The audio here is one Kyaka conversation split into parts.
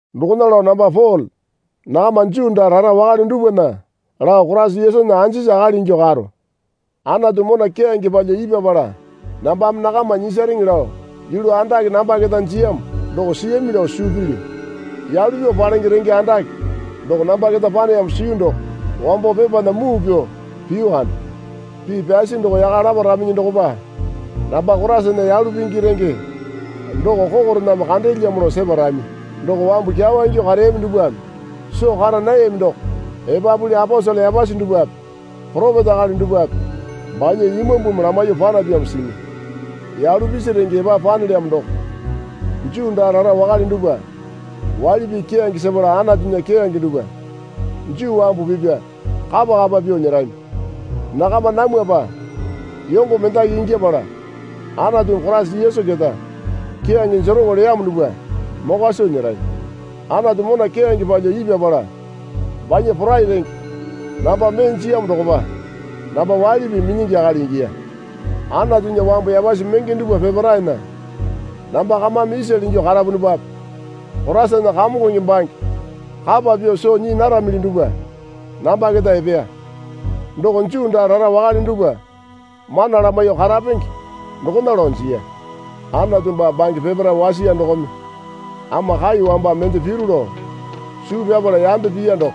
Dokona lao namba Pole nakama Juu daa rara wakale dupwana lao Koraisa Yesunya anjisi akali ingyuo karo. Anatu mona keyange palyuo ipyapala nambame nakama nyisareŋe lao yulu andake namba keta jiyamo doko siyami lao suu pilyu. Yalu pyuo palenge renge andake doko namba keta paneyamo siyu doko, (wambo pepana muu pyuo piyu kande. Pii pyasi doko yaka laparaminyi dokopa namba Koraisana yalu pingi renge doko kokorename kandeelyamo lao separami.) Doko wambu kyawa ingyuo kareyami dupwame soo kara nayami doko epapuli aposele yapasi dupwape poropeta akali dupwape banya Imambumi lamaiyuo panapyamo simi. Yalu pisi renge epapu panelyamo doko, Juu daa rara wakale dupwa waili pii keyange sepala Anatunya keyange dupwa Juu wambu pipya kapa kapa pyuo nyerami. Nakama namwapa yongo mendaki ingyapala Anatumi Koraisa Yesu keta keyange jeroŋo leyamo dupwa mokwa soo nyerami. Anatu mona keyange palyuo ipyapala banya porai renge namba mee jiyamo dokopa namba waili pii minyingi akali ingiya. Anatunya wambu yapasi menge dupwa peparaena namba kamame isale ingyuo karapunupape Koraisana kamongonge bange kapa pyuo soo nyii naramili dupwa namba keta epeya. Doko Juu daa rara wakale dupwa mana lamaiyuo karapenge dokona lao jiya. Anatu baa bange peparae wasiya dokome ama kai wamba mende piru lao suu pyapala yambe piya doko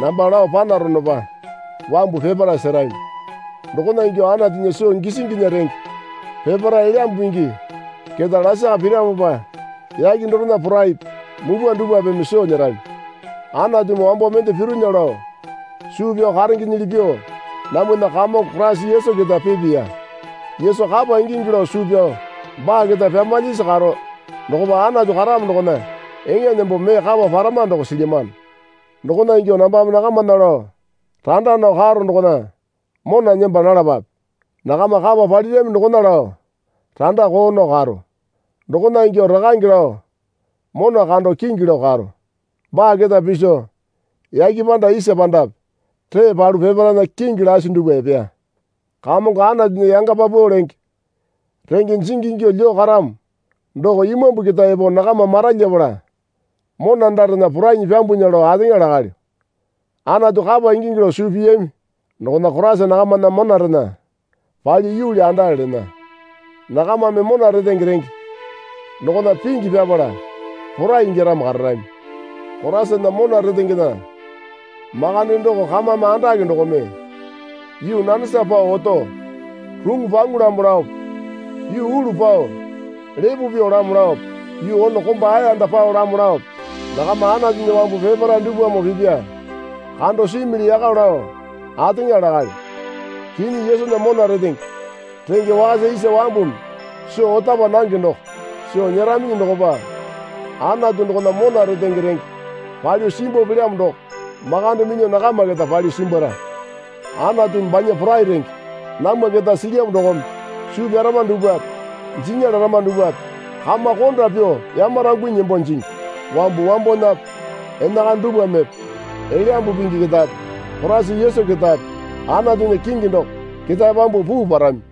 namba lao panaronopa wambu peparae serami. Dokona ingyuo Anatunya soo gisinginya renge peparae Elyambu Pingi keta lasaka piramopa yake dorena poraipi mupwa dupwapeme soo nyerami. Anatumi wambo mende pironya lao suu pyao karengenyili pyuo namwana Kamongo Koraisa Yesu keta pipiya. Yesu kapa ingingi lao suu pyao baa keta pyamalyisi karo dokopa Anatu karamo dokona eŋa nembo mee kapa parama doko silyamano. Dokona ingyo nambame nakamana lao randa nao karo dokona mona nemba nalapape. Nakama kapa palirami dokona lao randa koo nao karo. Dokona ingyuo Rakange lao mona kando kingi lao karo. Baa keta piso yake panda isa pandape ree palu peparaena kingi lasi dupwa epeya. Kamongo Anatunya yanga paupau lenge renge jingi ingyuo lyuo karamo doko Imambu keta epo nakama maralyapala mona andarena porainyi pyambunya lao ateŋa lakalyo. Anatu kapa ingingi lao suu piyami dokona Koraisa nakamana monarena palyuo yuuli andale lena. Nakamame mona retenge renge dokona pingi pyapala porai ingyaramo kararami. Koraisana mona rentengena makande doko kamame andake dokome, Yuu nanesa pao oto ruŋu paŋu lamo laope yuu ulu pao lepo pyuo lamo laope yuu ono komba ayanda pao lamo laope nakama Anatunya wambu peparae dupwamoo pipya, kando simili yaka lao ateŋa lakalyo. Kinyi Yesunya mona retenge renge wakasa isa wambumi soo ota paa nange doko soo nyeraminyi dokopa Anatu dokona mona retenge renge palyuo simbuo pelyamo doko makande minyuo nakama keta palyuo simbwara. Anatumi banya porai renge namwa keta silyamo dokome suu pyarama dupwape jinya larama dupwape kama konda pyuo yamarangunyi nembo jingi. Wambu wambowanape enakana dupwamepe Elyambu Pingi ketape Koraisa Yesu ketape Anatunya kingi doko ketae pyambuo puu parami.